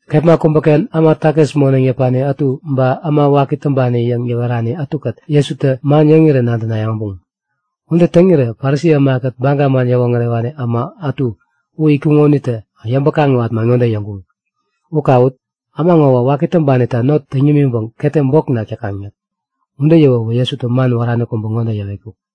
Kepma kubäken äma takis moneŋ yäpani ätu ba äma waki täŋpani yäŋ yäwerani ätukät Jesutä man yäŋirän nadänayäŋ äbuŋ. Ude täŋirä Parisi ämakät Baga man yäwoŋärewani äma ätu u itkuŋo unitä yäŋpäŋ-kaŋiwat man ŋode yäŋkuŋ; U kawut! Äma ŋowä waki täŋpanita not täŋ yämiŋpäŋ ketem bok nak täkaŋ yäk. Ude yäwäwä Jesutä man wärani kubä ŋode yäwetkuk;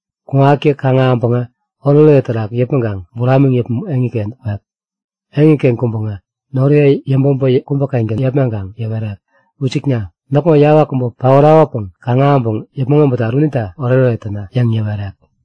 Kuŋatkä kaŋ-ahäŋpäŋä oretoret terak yäpmäŋkaŋ buramiŋ yäpmäŋ eŋiken kwek. Eŋiken kuŋpäŋä noriye yäŋpäbä kubä-kengän yepmaŋkaŋ yäwerek; Wisikna! Näkŋo yawak kubä paorakopäŋ kaŋ-ahäŋpäŋ yäpmäŋ abätat unita oretoret täna! yäŋ yäwerek.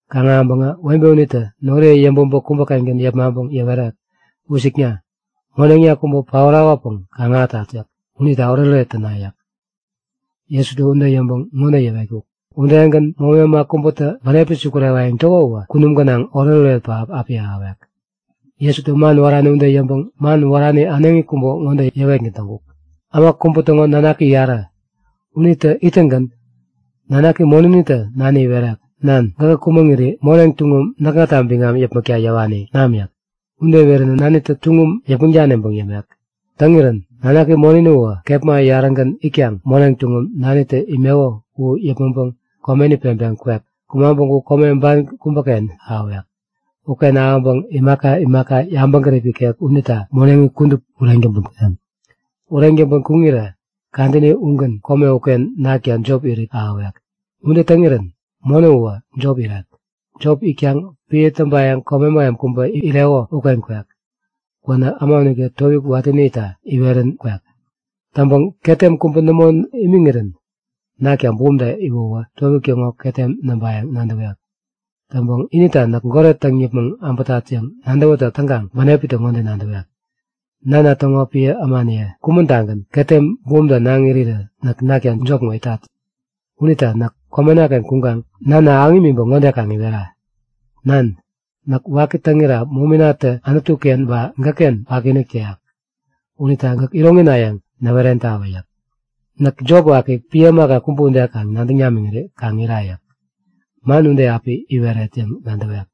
Kaŋ-ahäŋpäŋä webe unitä noriye yäŋpäbä kubä-kengän yepmaŋpäŋ yäwerek; Wisikna! Moneŋna kubä paorakopäŋ kaŋ-ahätat yäk. Unita oretoret täna yäŋ yäwerek. Jesutä ude yäŋpäŋ ŋode yäwetkuk; Udegän, momi äma kubätä bänepi sukurewayäŋ täko uwä, kunum gänaŋ oretoret pähap api ahäwek. Jesutä man wärani ude yäŋpäŋ man wärani äneŋi kubä ŋode yäwetgän täŋkuk; Äma kubä täŋo nanaki yarä. Unitä ittäŋgän nanaki monänitä nani iwerek; Nan, gäkä kumäŋiri moneŋ tuŋum näkŋata biŋam yäpmäkta yäwani u nam! yäk. Ude iweränä nanitä tuŋum yäpmäŋ daniŋpäŋ yämek. Täŋirän nanaki monäni uwä kepma yarägän itkaŋ moneŋ tuŋum nanitä imeko u yäpmäŋpäŋ komeni peŋpeŋ kwek. Kumaŋ päŋku kome ban kubäken ahäwek. Uken ahäŋpäŋ imaka imaka yabäŋgärip ikek unita moneŋi kudup ureŋ täŋpän kuneŋ. Ureŋ täŋpän kuŋirä kadäni ugän kome uken nakta jop irit ahäwek. Ude täŋirän monä uwä jop irek. Jop itkaŋ piä täŋpayäŋ kome mähem kubä ireko uken kwek. Kwänä äma unitä towik watäni itta iwerän kwek. Täŋpäŋ ketem kubä nämo imiŋirä nakta bumta iwäwä towik täŋo ketem näŋpayäŋ nadäwek. Täŋpäŋ inita näk goret täŋ yäpmäŋ äbätat yäŋ nadäwätäk täŋkaŋ bänepitä ŋode nadäwek; Nana täŋo piä ämaniye kumän-tagän ketem bumta naŋ irirä näk nakta jop ŋo itat. Unita näk komena-ken kuŋkaŋ nana ahäŋ imiŋpäŋ ŋode kaŋ iwera; Nan, näk waki täŋira mominatä Anutu-ken ba gäkken wakiinik täyak. Unita gäk iroŋina yäŋ näwerentawä yäk. Näk jop waki, piä ämaka kubä ude nadäŋ namiŋiri kaŋ ira yäk. Man ude api iweret yäŋ nadäwek.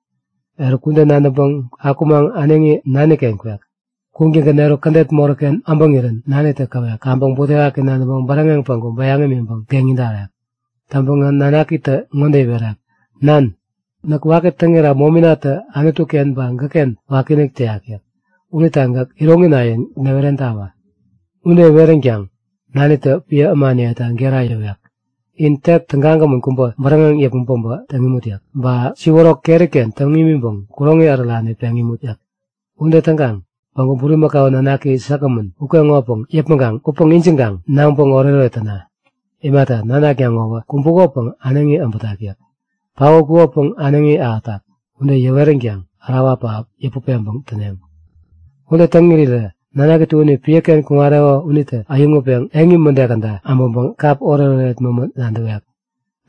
Eruk, ude nadäŋpäŋ akumaŋ äneŋi nani-ken kwek. Kuŋtäŋgän eruk, kädet moräk-ken äbäŋirän nanitä käwek. Kaŋpäŋ butewaki nadäŋpäŋ bäräŋeŋ päŋku bäyaŋ imiŋpäŋ geŋi darek. Täŋpäŋä nanakitä ŋode iwerek; Nan, näk waki täŋira mominatä Anutu-ken ba gäkken wakiinik täyak yäk. Unita gäk iroŋina yäŋ näwerentawä. Ude iweränkaŋ nanitä piä ämaniyeta gera yäwek; In tek tägagämän kubä bäräŋeŋ yäpmäŋ päbä täŋ imut! yäk. Ba siworok keri-ken täŋ imiŋpäŋ kuroŋi ärärani peŋ imut! yäk. Ude täŋkaŋ päŋku bulimakau nanaki säkgämän ukeŋopäŋ yäpmäŋkaŋ utpäŋ ijiŋkaŋ naŋpäŋ oretoret täna! Imata, nanakna ŋowä kumbukopäŋ äneŋi äbätak yäk. Paotkukopäŋ äneŋi ahätak. Ude yäweränkaŋ ärawa pähap yäput peŋpäŋ täneŋ. Ude täŋ irirä nanaki tuäni piäken kuŋareko unitä äyäŋutpeŋ eŋi mäde käda äbäŋkaŋ kap oretoret mämä nadäwek.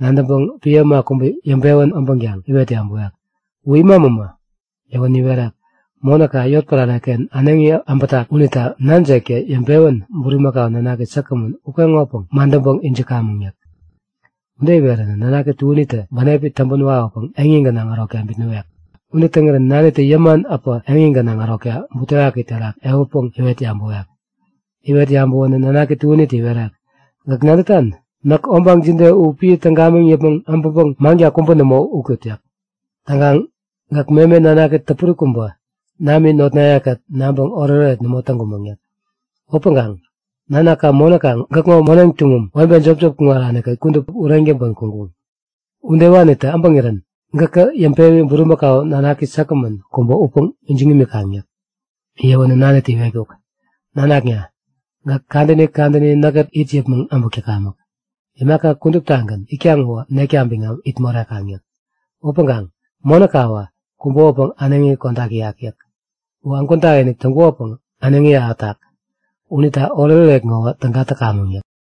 Nadäŋpäŋ piä äma kubä yäŋpewän abänkaŋ iwet yabäwek; U ima mämä? Yäwänä iwerek; Monäka yotpärareken äneŋi äbätak unita nanjektä yäŋpewän bulimakau nanaki säkgämän ukeŋopäŋ madäŋpäŋ ijikamäŋ yäk. Ude iweränä nanaki tuänitä bänepi täŋpän wawäpäŋ eŋi gänaŋ ärokta bitnäwek. Ude täŋirän nanitä yäman äpä eŋi gänaŋ ärokta butewaki terak ehutpäŋ iwet yabäwek. Iwet yabäwänä nanaki tuänitä iwerek; Gäk nadätan? Näk obaŋ jide u piä täŋ gamiŋ yäpmäŋ äbäŋpäŋ manka kubä nämo ut täyat. Täŋkaŋ gäk meme nanaki täpuri kubä nami notnayekät naŋpäŋ oretoret nämo täŋkumäŋ yäk. Upäŋkaŋ nanaka monäka gäkŋo moneŋ tuŋum webe jopjop kuŋaranita kudup ureŋ täŋpän kuŋkuŋ! Udewanitä äbäŋirän gäkä yäŋpewi bulimakau nanaki säkgämän kubä utpäŋ ijiŋ imikaŋ yäk. Yäwänä nanitä iwerek; Nanakna! Gäk kadäni kadäni näkkät it yäpmäŋ äbäk täkamäk. Imaka kuduptagän itkaŋ uwä nekta biŋam it morekaŋ yäk. Upäŋkaŋ monäkawä kumbukopäŋ äneŋi kodak täyak yäk. Uwä ägwän takinik täŋkukopäŋ äneŋi ahätak. Unita oretoret ŋowä täga täkamäŋ yäk.